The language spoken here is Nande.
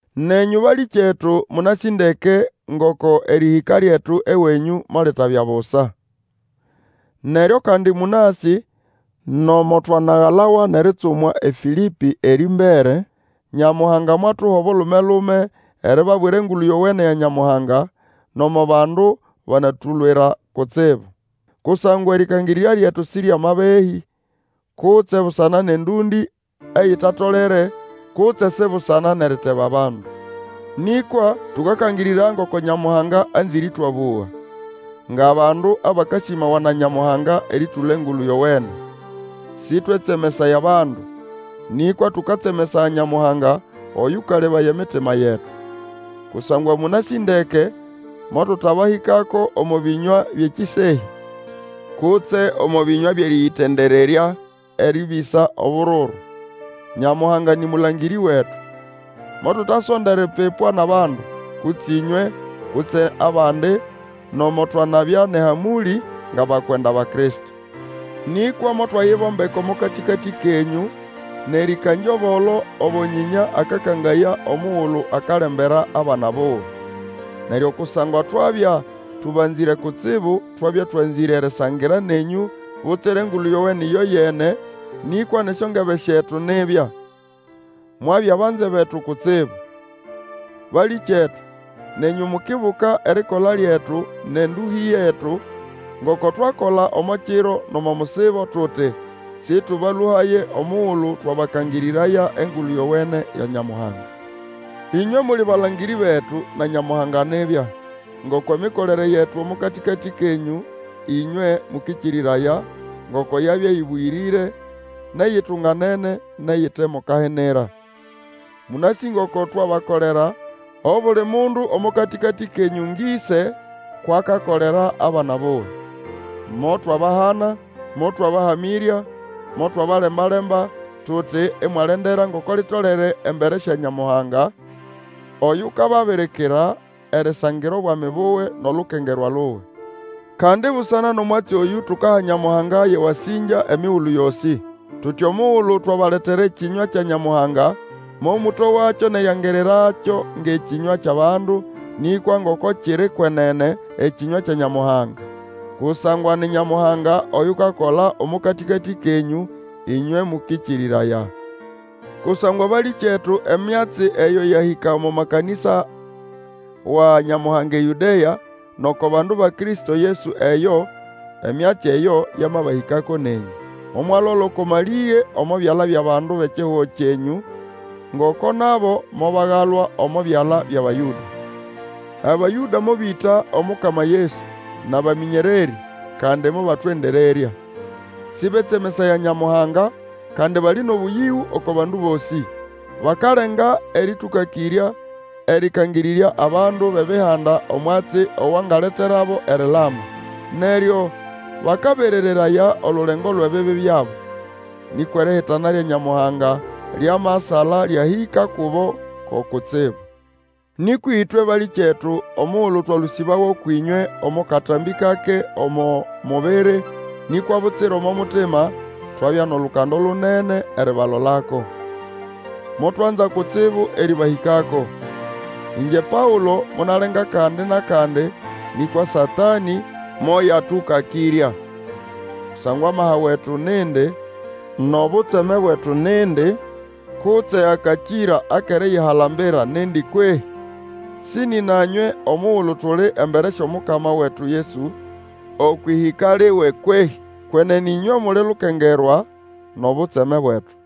Nenyũ, balĩkyetu, mũnasĩ ndeke, ngoko erĩhĩka lyetu ewenyũ molitabya busa. Neryo kandi mũnasĩ, nomo twanagalawa nʼeritsumwa eFĩlĩpĩ, erĩmbere, Nyamuhanga mwatuha obulume-lume eribabwira Engulu Yowene ya Nyamuhanga, nomo bandu banatulwira kutsibu. Kusangwa erĩkangĩrĩrya lyetu si ryʼamabehĩ, kutse busana nʼendũndĩ eyitatolere, kutse si busana nʼeriteba bandu. Nĩkwa, tũkakangĩrĩraya ngoko Nyamuhanga anzĩre ĩtwabũga, ngʼabandu abakasĩmawa na Nyamuhanga erĩtũla Engulu Yowene. Sĩtwetsemesaya bandu, nĩkwa tũkatsemesaya Nyamuhanga Oyũkalebaya emitima yetu. Kusangwa mũnasĩ ndeke, motũtabahĩkako omo bĩnywa byʼekĩsehya, kutse omo bĩnywa byʼerĩyĩtendererya erĩbĩsa obururu. Nyamuhanga nĩ mũlangĩrĩ wetu! Motutasonda eripipwa nʼabandu, kutse ĩnywe, kutse abandi, nomo twanabya nʼehamũlĩ ngʼabakwenda ba Kristo. Nĩkwa motwayibombeka omo katĩkatĩ kenyũ nʼerĩkangya obolo obo nyĩnya akakangaya omugulu akalembera abana buwe. Neryo kusangwa twabya tũbanzĩre kutsibu twabya twanzĩre erisangira nenyũ butsira Engulu Yowene ĩyoyene, nĩkwa nʼesyongebe syetu nibya. Mwabya banze betu kutsibu! Balĩkyetu, nenyũ mukibuka erikola lyetu nʼendũhĩ yetu, ngoko twakola omo kiro nʼomo musibo tuti, sĩtũbalũhaye omugulu twabakangĩrĩraya Engulu Yowene ya Nyamuhanga. Inywe muli balangĩrĩ betu, na Nyamuhanga nibya, ngoko emikolere yetu omo katĩkatĩ kenyũ ĩnywe mũkĩkĩrĩraya, ngoko yabya ĩbũyĩrĩre, nʼeyitunganene, nʼeyite mo kahinira. Mũnasĩ ngoko twabakolera, obuli mundu omo katĩkatĩ kenyũ ngʼĩse kwʼakakolera abana buwe. Motwabahana, motwabahamĩrya, motwabalemba-lemba, tuti imwalendera ngoko litolere embere sya Nyamuhanga, oyukababirikira erisangira obwami buwe nʼolukengerwa luwe. Kandi busana nʼomwatsi oyũ, tukaha Nyamuhanga yʼewasĩngya emigulu yosĩ. Tuti, omugulu twabaletera ekĩnywa kya Nyamuhanga, momũtowakyo nʼeriangirirakyo ngʼekĩnywa kyʼabandu, nĩkwa ngoko kiri kwenene, ekĩnywa kya Nyamuhanga. Kusangwa ni Nyamuhanga oyukakola omo katĩkatĩ kenyũ ĩnywe mũkĩkĩrĩraya. Kusangwa balĩkyetu, emyatsi eyo yahĩka omo makanĩsa wa Nyamuhanga eYũdea, nʼoko bandu ba Kristo Yesu eyo; emyatsi eyo yamabahĩkako nenyũ. Momwalola oko malĩge omo byala byʼabandu bʼekihugo kyenyũ, ngoko nabo mobagalwa omo byala byʼAbayũda. Abayũda mobĩta Omukama Yesu, nʼabamĩnyererĩ, kandi mobatwendererya. Sĩbetsemesaya Nyamuhanga, kandi bali nʼobũyĩgũ oko bandu bosĩ. Bakalenga erĩtũkakĩrya erĩkangĩrĩrya abandu bʼEbihanda omwatsi owangaleterabo erilama. Neryo bakaberereraya olulengo lwʼebibi byabo. Nĩkwa erihitana lya Nyamuhanga lyamasala lyahĩka kubo ko kutsibu. Nĩkwa ĩtwe, balĩkyetu, omugulu twalũsĩbawa ũkwʼĩnywe omo katambĩ kake omo mubiri nĩkwa butsira omo mutima, twabya nʼolukando lunene eribalolako. Motwanza kutsibu erĩbahĩkako. Ĩngye Paũlo, monalenga kandi nʼakandi, nĩkwa Satanĩ moyatũkakĩrya. Kusangwa amaha wetu nindi, nʼobutseme bwetu nindi, kutse akakĩra akʼeriyihalambira nindi kwehĩ? Sĩ nĩna nywe omugulu tuli embere syʼOmukama wetu Yesu okwʼĩhĩka liwe kwehĩ? Kwenene ĩnywe muli lukengerwa nʼobutseme bwetu.